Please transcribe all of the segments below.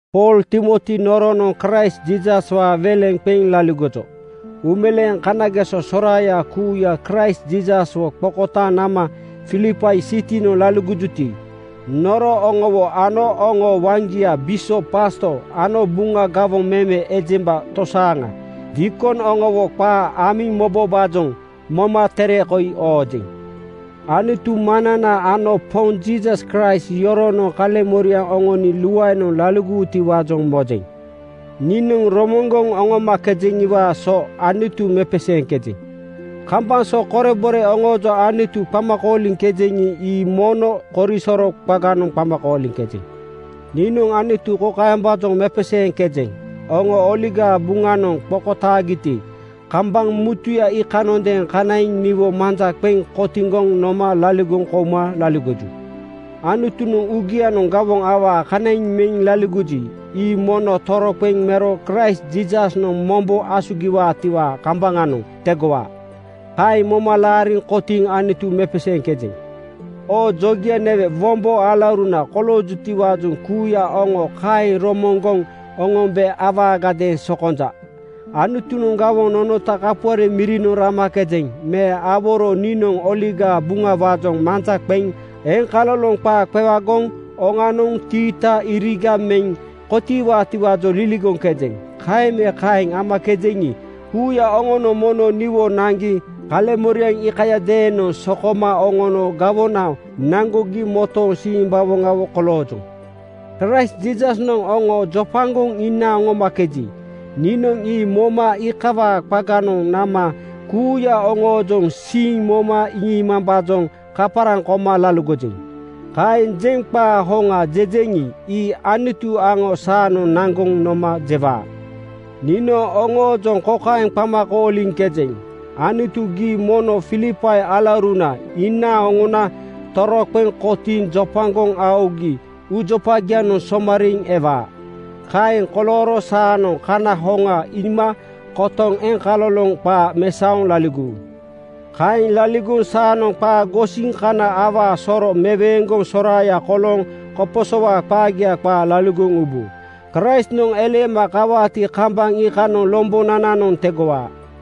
Pool Timoti noronoŋ Kraist Jiisaswaa weleŋ qeŋ laligojo. Uumeleeŋ kanageso soraaya kuuya Kraist Jiisaswo qokotaaŋ nama Filipai sitinoŋ laligojuti, noro oŋowo ano oŋoo waŋgia (bisop, pasto) ano Buŋa gawoŋ meme ejemba tosaaŋa (diikon) oŋowo qaa amiŋ mobombaajoŋ moma tere koi oojeŋ. Anutu Maŋnana ano Poŋ Jiisas Kraist yoronoŋ kaleŋmoriaŋ oŋoni luaenoŋ laligowutiwaajoŋ mojeŋ. Niinoŋ romoŋgoŋ oŋomakejeŋiwaa so Anutu mepeseeŋkejeŋ. Kambaŋ so korebore oŋoojoŋ Anutu qama kooliŋkejeŋi, ii mono korisoro qaganoŋ qama kooliŋkejeŋ. Niinoŋ Anutu kokaembaajoŋ mepeseeŋkejeŋ: Oŋo Oligaa Buŋanoŋ qokotaagiti, kambaŋ mutuya iikanoŋadeeŋ kanaiŋ niwo manja qeŋ kotiŋgoŋ noma laligoŋ kouma laligoju. Anutunoŋ uugianoŋ gawoŋ awaa kanaiŋ meŋ laligoji, ii mono toroqeŋ mero Kraist Jiisasnoŋ mombo asugi-waatiwaa kambaŋanoŋ tegowaa. Kaeŋ moma laariŋ kotiiŋ Anutu mepeseeŋkejeŋ. Oo jogia newe, wombo alauruna koloojutiwaajoŋ kuuya oŋo kaeŋ romoŋgoŋ oŋombe awaagadeeŋ sokonja. Anutunoŋ gawoŋ nonota kapuare mirinoŋ ramakejeŋ me aworo niinoŋ Oligaa Buŋawaajoŋ manja qeŋ eŋkaloloŋ qaa qewagoŋ qaa oŋanoŋ tiita iriga meŋ kotiiwaatiwaajoŋ liligoŋkejeŋ. Kaeŋ me kaeŋ amakejeŋi, kuuya oŋonoŋ mono niwo naŋgi kaleŋmoriaŋ iikayadeenoŋ sokoma oŋono gawona naŋgogi motooŋ simbawoŋawo koloojoŋ. Kraist Jiisasnoŋ oŋo jopagoŋ inaaŋ oŋomakeji, niinoŋ ii moma iikawaa qaganoŋ nama kuuya oŋoojoŋ siiŋ moma iŋiimambaajoŋ kaparaŋ koma laligojeŋ. Kaeŋ jeŋ qaa hoŋa jejeŋi, ii Anutu aŋo saanoŋ naŋgoŋ noma jewaa. Niinoŋ oŋoojoŋ kokaeŋ qama kooliŋkejeŋ: Anutu, gii mono Filipai alauruna inaaŋ oŋona toroqeŋ kotiiŋ jopagoŋ aogi uujopagianoŋ somariiŋ seiwaa. Kaeŋ kolooro saanoŋ kana hoŋa iima kotoŋ eŋkaloloŋ qaa mesaoŋ laligowu. Kaeŋ laligoŋ saanoŋ qaa gosiŋ kana awaa soro meweeŋgoŋ soraaya kolooŋ koposowaa qaagia qaa laligoŋ ubu. Kraistnoŋ eleema kawaati, kambaŋ iikanoŋ lombonananoŋ tegowaa.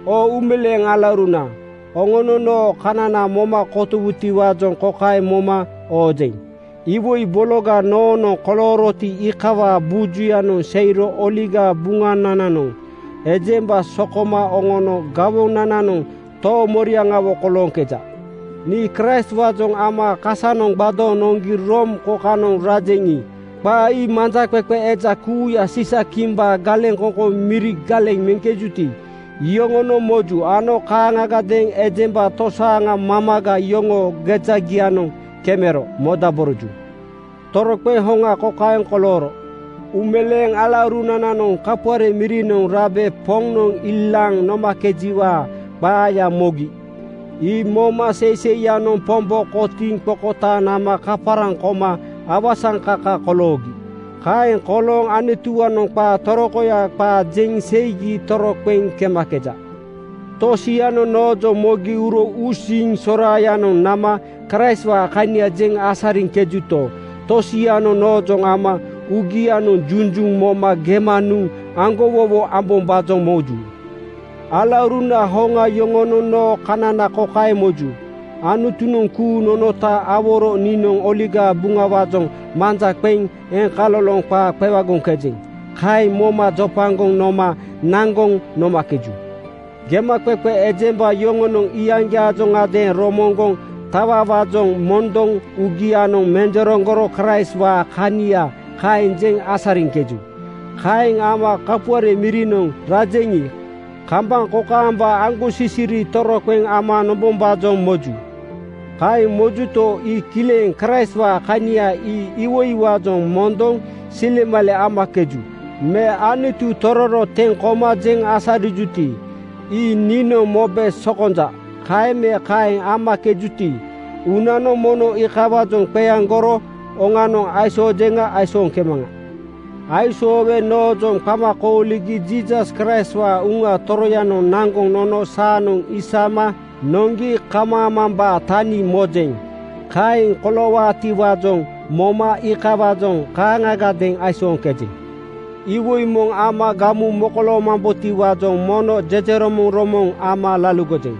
Oo uumeleeŋ alauruna, oŋonoŋ noo kanana moma kotowu-tiwaajoŋ kokaeŋ moma oojeŋ: Iwoi bologa noonoŋ kolooroti, iikawaa bujuyanoŋ seiro Oligaa Buŋanananoŋ ejemba sokoma oŋono gawona-nanoŋ toomoriaŋawo kolooŋkeja. Nii Kraistwaajoŋ ama kasanoŋ gbadooŋ noŋgi Room kokanoŋ rajeŋi, qaa ii manjaqeqe eja kuuya Siisa-kimbaa galeŋkoŋkoŋ miri galeŋ meŋkejuti, iyoŋonoŋ moju ano kaaŋagadeeŋ ejemba tosaaŋa mamaga yoŋoo gejagianoŋ kemero modaboroju. Toroqeŋ hoŋa kokaeŋ kolooro: Uumeleeŋ alaurunananoŋ kapuare mirinoŋ rabe Poŋnoŋ ilaaŋ nomakejiwaa qaaya mogi. Ii moma seiseiyanoŋ Pombo kotiiŋ qokotaaŋ nama kaparaŋ koma awasaŋkaka koloogi. Kaeŋ kolooŋ Anutuwaanoŋ qaa torokoya qaa jeŋ seigi toroqeŋ kemakeja. Tosianoŋ noojoŋ mogi uro uusiiŋ soraayanoŋ nama Kraistwaa kania jeŋ asariŋkejuto, tosianoŋ noojoŋ ama uugianoŋ junjuŋ moma gema nuŋ aŋgowowo ambombaajoŋ moju. Alauruna hoŋa yoŋonoŋ noo kanana kokaeŋ moju: Anutunoŋ kuuŋ nonota aworo niinoŋ Oligaa Buŋawaajoŋ manja qeŋ eŋkaloloŋ qaa qewagoŋkejeŋ. Kaeŋ moma jopagoŋ noma naŋgoŋ nomakeju. Gemaqeqe ejemba yoŋonoŋ iyaŋgiaajoŋadeeŋ romoŋgoŋ tawawaajoŋ mondoŋ uugianoŋ menjereŋgoro Kraistwaa kania kaeŋ jeŋ asariŋkeju. Kaeŋ ama kapuare mirinoŋ rajeŋi, kambaŋ kokaamba aŋgosisiri toroqeŋ ama nombombaajoŋ moju. Kaeŋ mojuto, ii kileŋ. Kraistwaa kania ii iwoiwaajoŋ mondoŋ silemale amakeju me Anutu tororo teŋ koma jeŋ asariŋkejuti, ii niinoŋ mobe sokonja. Kaeŋ me kaeŋ amakejuti, uunanoŋ mono iikawaajoŋ qeaŋgoro oŋanoŋ aisoojeŋa aisooŋkemaŋa. Aisoowe noojoŋ qama kooligi Jiisas Kraistwaa Uŋa Toroyanoŋ naŋgoŋ nono saanoŋ isama noŋgi kamaamambaa tani mojeŋ. Kaeŋ koloowaati-waajoŋ moma iikawaajoŋ kaaŋagadeeŋ aisooŋkejeŋ. Iwoi moŋ ama gamu mokoloomambotiwaajoŋ mono jejeromoŋromoŋ ama laligojeŋ.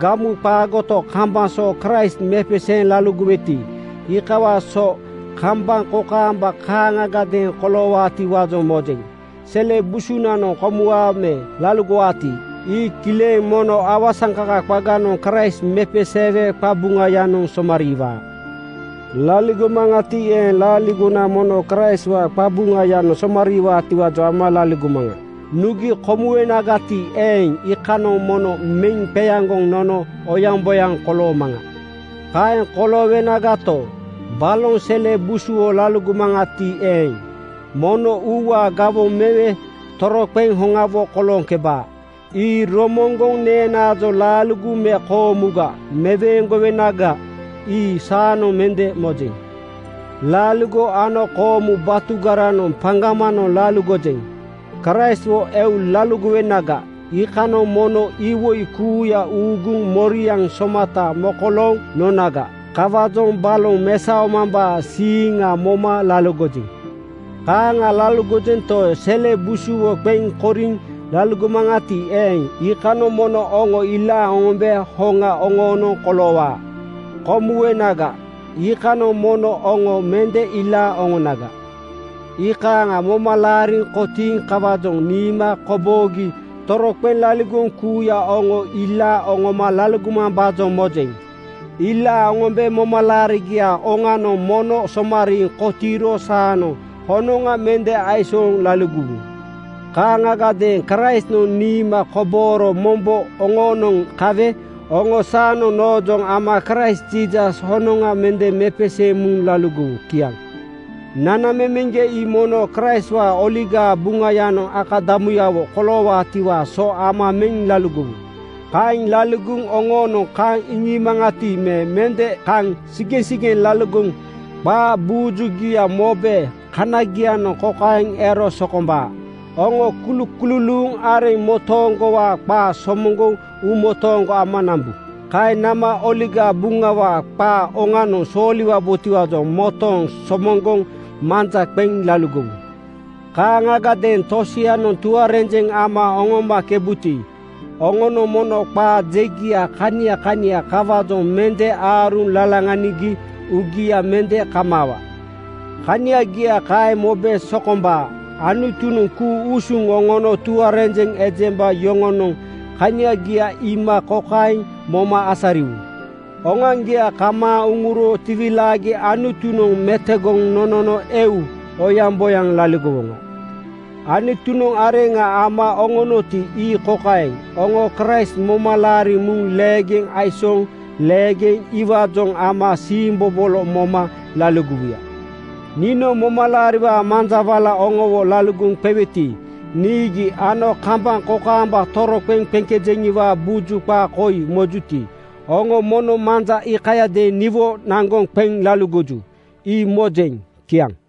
Gamu qaagoto, kambaŋ so Kraist mepeseeŋ laligoweti, iikawaa so kambaŋ kokaamba kaaŋagadeeŋ koloowaatiwaajoŋ mojeŋ. Sele busunanoŋ komuwaa me laligowaati, ii kileŋ mono awasaŋkaka qaganoŋ Kraist mepeseewe qabuŋayanoŋ somariiwaa. Laligomaŋati eeŋ, laaligona mono Kraistwaa qabuŋayanoŋ somariiwaatiwaajoŋ ama laligomaŋa. Nugi komuwenagati eeŋ, iikanoŋ mono meŋ qeaŋgoŋ nono oyaŋboyaŋ koloomaŋa. Kaeŋ koloowenagato, balonoŋ sele busuwo laligomaŋati eeŋ, mono uuwaa gawoŋ mewe toroqeŋ hoŋawo kolooŋkebaa. Ii romoŋgoŋ neenaajoŋ laaligo me koomuga meweeŋgowenaga, ii saanoŋ mende mojeŋ. Laaligo ano koomu batugaranoŋ papaŋgoŋ laligojeŋ. Kraistwo eu laligowenaga, iikanoŋ mono iwoi kuuya uuguŋ moriaŋ somata mokolooŋ nonaga. Kawaajoŋ baloŋ mesaomambaa siiŋa moma laligojeŋ. Kaaŋa laligojento, sele busuwo qeŋ koriŋ laligomaŋati eeŋ, iikanoŋ mono oŋo ilaaŋ oŋombe hoŋa oŋoonoŋ koloowaa. Komu-wenaga, iikanoŋ mono oŋo mende ilaaŋ oŋonaga. Iikaaŋa moma laariŋ kotiiŋ kawaajoŋ niima koboogi toroqeŋ laligoŋ kuuya oŋo ilaaŋ oŋoma laligomambaajoŋ mojeŋ. Ilaaŋ oŋombe momalaarigiaa oŋanoŋ mono somariiŋ kotiiro saanoŋ honoŋa mende aisooŋ lali-gowu. Kaaŋagadeeŋ Kraistnoŋ niima kobooro mombo oŋoonoŋ kawe oŋo saanoŋ noojoŋ ama Kraist Jiisas honoŋa mende mepeseeŋ muŋ laligowu. Kiaŋ. Nanamemeŋgia ii mono Kraistwaa Oligaa Buŋayanoŋ akada-muyawo koloowaatiwaa so ama meŋ laligowu. Kaeŋ laligogi oŋoo-noŋ kaŋ iŋiimaŋati me mende kaŋ sigeŋsigeŋ laligoŋ qaa bujugia mobe kanagianoŋ kokaeŋ ero sokombaa: Oŋo kulukululuu areŋ motooŋgowaa qaa somoŋgoŋ uumotooŋgo ama nambu. Kaeŋ nama Oligaa Buŋawaa qaa oŋanoŋ sooliwabotiwaajoŋ motooŋ somoŋgoŋ manja qeŋ laligowu. Kaaŋagadeeŋ tosianoŋ tuarenjeŋ ama oŋomakebuti, oŋonoŋ mono qaa jegia kania kania kawaajoŋ mende aaruŋ lalaŋanigi uugia mende kamaawa. Kaniagia kaeŋ mobe sokombaa. Anutunoŋ ku-usuŋ oŋono tuarenjeŋ ejemba yoŋonoŋ kaniagia iima kokaeŋ moma asariwu: Oŋoaŋgia kamaaŋ uŋuro tiwilaagi Anutunoŋ metogoŋ nonono eu oyaŋboyaŋ laligowoŋa. Anutunoŋ areŋa ama oŋonoti, ii kokaeŋ: Oŋo Kraist moma laariŋ muŋ leegeŋ aisooŋ leegeŋ iwaajoŋ ama siimbobolo moma laligowuya. Niinoŋ momalaariwaa manja wala oŋowo laligoŋ qeweti, niigi ano kambaŋ kokaamba toroqeŋ qeŋkejeŋiwaa buju qaa koi mojuti, oŋo mono manja iikayadeeŋ niwo naŋgoŋ qeŋ laligoju, ii mojeŋ. Kiaŋ.